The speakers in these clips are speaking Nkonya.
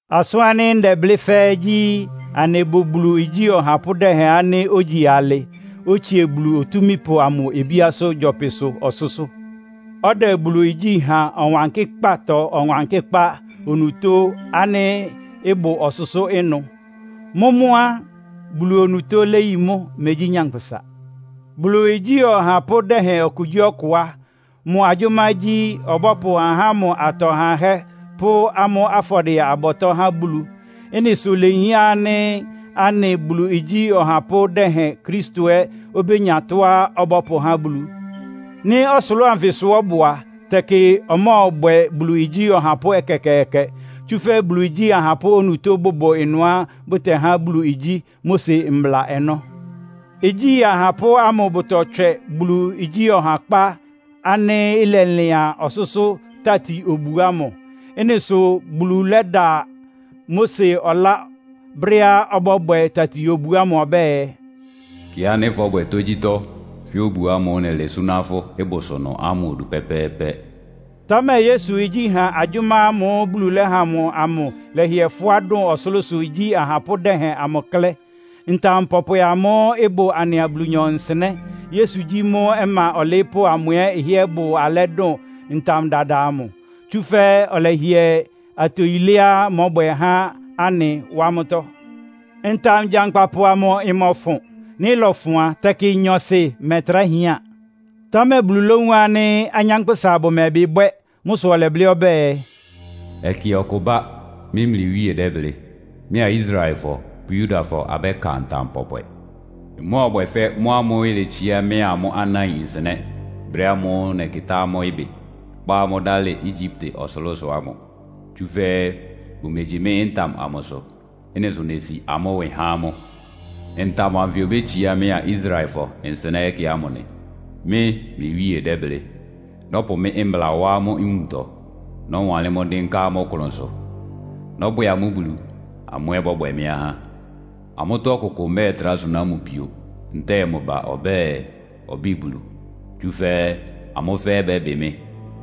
Asʋ́n ánɩ́ ndɛblɩ́ fɛ́ɛ́ gyí, anɩbʋ Bulu igyí ɔhapʋ́ dɛhɛn ánɩ́ ógyi alɩ, otsie Bulu Otúmípʋ amʋ obíá gyɔpɩsʋ ɔsʋ́sʋ́. Ɔdɛ Bulu igyí ha Ɔwankɩ́kpátɔ Ɔwankɩ́kpá onutó ánɩ́ ɩbʋ ɔsʋ́sʋ́ ɩnʋ. Mʋ́ mʋ́ á, Bulu onutó léyi mʋ́, megyí nyankpʋsa. Bulu igyí ɔhapʋ́ dɛhɛn okugyíɔkʋ á, mʋ agyʋ́má gyí, ɔbɔ́pʋ ahá ámʋ atɔ hahɛ́ pʋ́ amʋ́ afɔdɩɛ-abɔtɔ́ há Bulu. Ɩ́nɩ sʋ ilehián ánɩ́ anɩ Bulu igyí ɔhapʋ́ dɛhɛn Kristo ɛ́ obénya tɔ́á ɔbɔ́pʋhá Bulu. Nɩ́ ɔsʋlʋ́ʋ anfɩsʋ ɔ́bʋ a, tɛkɩ ɔmɔ́ɔbwɛ Bulu igyí ɔhapʋ́ ɛkɛkɛɛkɛ. Tsúfɛ́ Bulu igyí ahapʋ́ onutó bʋbʋ ɩnʋá bʋtɛhá Bulu igyí Mose mbla ɔnɔ́. Igyí ahapʋ́ amʋ bʋtɔtswɛ Bulu igyí ɔhakpá ánɩ́ ɩlɛlɩan ɔsʋ́sʋ́ tati-obu ámʋ. Ɩ́nɩ sʋ Bulu lɛ́da Mose ɔlá brɛ́á ɔbɔ́bwɛ tati-obu ámʋ ɔbɛ́ɛ, “Kɩ ánɩ́ fɔ́bwɛ tógyítɔ́ fɛ́ obu ámʋ́ʋ́ nɛlɛ súná fʋ́ ɩbʋsʋ ɩnʋ ámʋ odu pɛ́pɛ́ɛ́pɛ́.” Támɛ Yesu igyíha agyʋ́má ámʋ́ʋ́ Bulu lɛ́ha mʋ amʋ lɛ́hɩɛ́ fʋ́á dʋn ɔsʋlʋ́sʋ igyí ahapʋ́ dɛhɛn amʋ klɛ́. Ntam pɔpwɛ ámʋ́ʋ́ ɩbʋ anɩa Bulu nsɩnɛ́, Yesu gyí mʋ́ ɔma ɔlɩɩ́pʋ́ amʋ ɛ́ ɩhɩ́ɛ́ bʋ alɛ́ dʋn ntam dada amʋ. Tsúfɛ́ ɔlɛhɩɛ atoyiléá mɔ́bwɛ há anɩ wá mʋ́tɔ́. Ntam gyankpapʋ amʋ ɩmɔfʋn. Nɩ́ ɩlɔfʋn a, tɛkɩ nyɔɔsɩ mɛtrá hián. Támɛ Bulu lówun ánɩ́ anyánkpʋ́sa bʋmɛbɩ́ bwɛ́. Mʋ́ sʋ ɔlɛblɩ́ ɔbɛ́ɛ, “Ɛkɛ ɔkʋ ɩbá. Mɩ́ mlɩ Wíe dɛ́blɩ́. Mɩ́a Israelfɔ pʋ́ Yudafɔ abɛ́ka ntam pɔpwɛ. Ɩmɔ́ɔbwɛ fɛ́ mʋ́ ámʋ́ʋ́ iletsiá mɩ́a amʋ́ anáin nsɩnɛ́, brɛ́ ámʋ́ʋ́ nɛkɩtá amʋ́ ɩbɩ, kpá amʋ́ dalɩ Egyipte ɔsʋlʋ́sʋ ámʋ. Tsúfɛ́ bʋmegyi mɩ́ ntam amʋsʋ. Ɩ́nɩ sʋ nesi amʋ́ ɩwɩ há amʋ́. Ntam anfɩ obétsiá mɩ́a Israelfɔ nsɩnɛ́ ɛkɛ ámʋ nɩ. Mɩ́ mlɩ Wíe dɛ́blɩ́. Nɔ́pʋ mɩ́ mbla wá amʋ́ nwuntɔ, nɔ́wanlɩ́n mʋ́ dɩ́nká amʋ́ klʋnsʋ. Nɔ́bwɛ amʋ́ Bulu, amʋ́ ɛ́ bɔ́bwɛ mɩ́ ahá. Amʋ́tɔ́ ɔkʋkʋ mɛ́ɛtrá suná mʋ pio, ntɛ́ɛ mʋ ba ɔbɛ́ɛ, ɔbɩ́ɩ Bulu. Tsúfɛ́ amʋ́ fɛ́ɛ́ bɛ́bɩ mɩ́.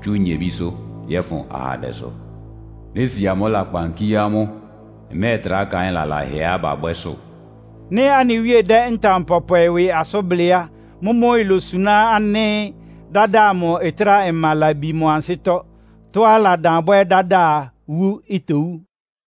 Tsú nyebísʋ́ yɔ́fʋn ahandɛsʋ. Nési amʋ́ lakpan kíé amʋ́. Mmɛ́ɛtrá kaɩ́n lalahɛá babwɛ́sʋ́.” Nɩ́ anɩ Wíe dɛ́ ntam pɔpwɛ ɩwɩ asʋ́n blɩ́ á, mʋ́mʋ́ ilosuná ánɩ́ dada amʋ ɩtráa ma labi mʋ ansɩ́tɔ́. Tɔ́á ɩladan bwɛ dáda a, wu itowú.